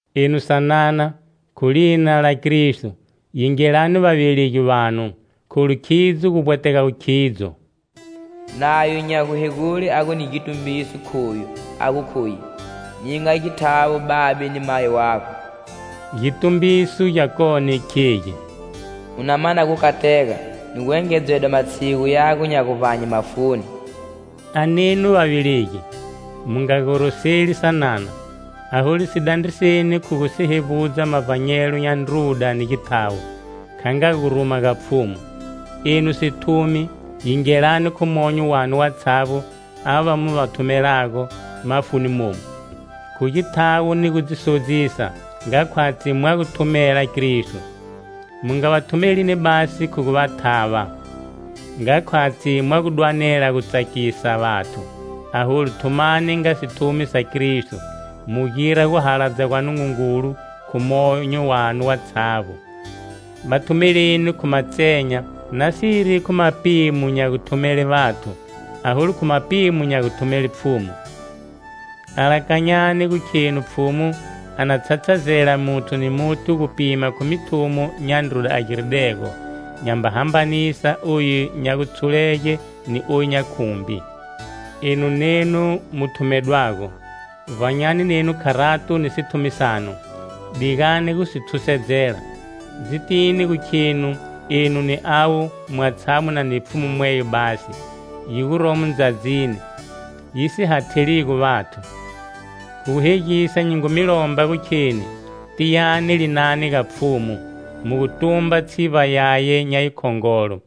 Enu sanana, khu lina la Kristo, yingelani vavelegi vanu, kholu khidzo gu vbwetegago khidzo. Nayo nya guhegule a gu ni gitumbiso khoyu a gu khuye: "Ninga githawo babe ni mayi wago." Gitumbiso gyakone khegi: "U na mana gukatega ni gu engedzedwa matshigu yago nya guvbanye mafuni." A nenu vavelegi, mu nga goroseli sanana, aholu si dandriseni khu gu si hevbudza mavbanyelo nya ndruda ni githawo, kha nga guruma ga Pfhumu. Enu sithumi, yingeleni khu monyo wanu watshavbo ava mu va thumelago mafuni momu, khu githawo ni gu dzi sodzisa nga khwatshi mwa gu thumelani Kristo. Mu nga va thumelini basi khu gu va thava, nga khwatshi mwa gu dwanela gu tsakisa vathu, aholu thumani nga sithumi sa Kristo, mu gira guhaladza gwa Nungungulu khu monyo wanu watshavbo. Va thumeleni khu matsenya, nasiri khu mapimo nya guthumele vathu, aholu khu mapimo nya guthumele Pfhumu. Alakanyani gu khenu Pfhumu a na tshatshazela muthu ni muthu gupima khu mithumo nya ndruda a giridego, nyamba hambanisa oyu nya gutshulege ni oyu nya khumbi. Enu nenu mu thumedwago, vbanyani nenu kharato ni sithumi sanu. Digani gu si thusedzela, dzitini gu khenu enu ni avo, mwatshavbo mu na ni Pfhumu mweyo basi, yi guromo ndzadzini, yi si hathaligo vathu. Khu gu hegisa nyi ngu mi lomba gu kheni tiyani linani ga Pfhumu, mu gu tumba tshivba yaye nya yikhongolo.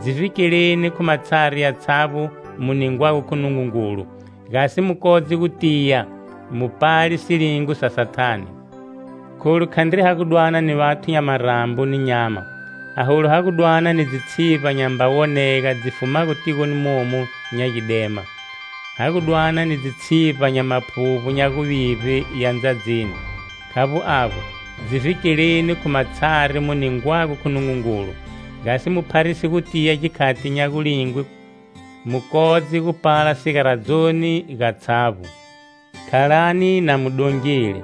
Dzi vhikeleni khu matshari yatshavbo mu ningwago khu Nungungulu, gasi mu kodze gu tiya, mu pale silingo sa Sathane. Kholu khandri ha gu dwana ni vathu nya marambo ni nyama, aholu ha gu dwana ni dzitshivba nyamba wonega dzi fumago tigoni momu nya gidema, ha gu dwana ni dzitshivba nya maphuvbo nya guvivbe ya ndzadzini. Khavbo avbo, dzi vhikeleni khu matshari mu ningwago khu Nungungulu, gasi mu pharise gutiya gikhati nya gulingwe, mu kodze gupala sigaradzoni gatshavbo. Khalani na mu dongile,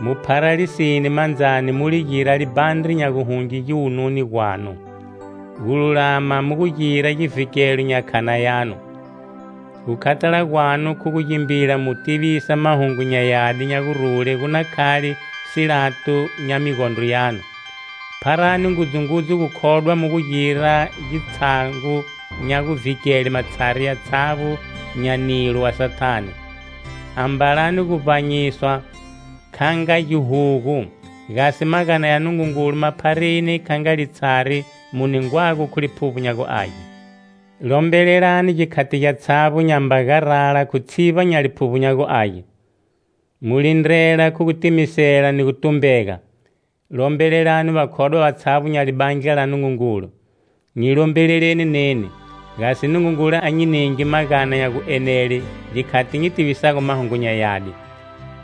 mu phara lisine mandzani, mu li gira libhandre nya guhunge giwununi gwanu; gululama mu gu gira givhikelo nya khana yanu; gukhathala gwanu khu gu gimbila mu gu tivisa Mahungu nya Yadi nya gurule gu na khale silato nya migondro yanu. Pharani ngudzungudzu gukhodwa mu gu gira gitshango nya guvhike matshari yatshavbo nya nilo wa Sathane. Ambalani guvbanyiswa kha nga gihugu, gasi magana ya Nungungulu ma phareni kha nga litshari mu ningwago khu Liphuvbo nya gu Age. Lombelelani gikhati gyatshavbo nyamba garala khu tshivba nya Liphuvbo nya gu Age; mu lindrela khu gutimisela ni gutumbega. Lombelelani vakhodwa vatshavbo nya libandla la Nungungulu. Nyi lombeleleni neni, gasi Nungungulu a nyi ninge magana nya guenela gikhati nyi tivisago Mahungu nya Yadi.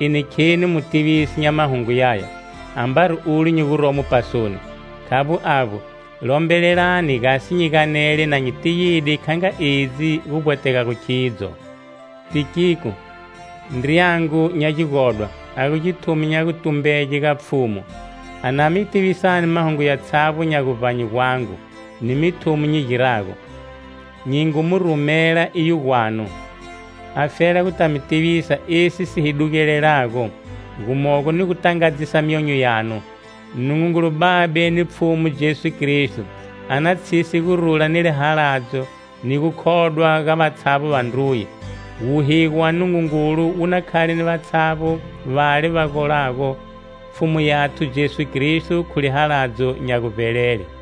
Eni kheni mutivisi nya Mahungu yaya, ambari olu nyi guromo pasoni. Khavbo avbo, lombelelani gasi nyi ganele na nyi tiyide kha nga edzi gu vbwetegago khidzo. Tikiko, ndriyangu nya gigodwa, a gu githumi nya gutumbege ga Pfhumu, a na mi tivisani mahungu yatshavbo nya guvbanye gwangu ni mithumo nyi girago. Nyi ngu mu rumela iyo gwanu afela guta mi tivisa esi si hi dugelelago, gumogo ni gu tangadzisa myonyo yanu. Nungungulu Babe ni Pfhumu Jesu Kristo a na tshise gurula ni lihaladzo ni gukhodwa ga vatshavbo vandruye. Wuhigo wa Nungungulu wu na khale ni vatshavbo vale va golago Pfhumu yathu Jesu Kristo khu lihaladzo nya guvbelele.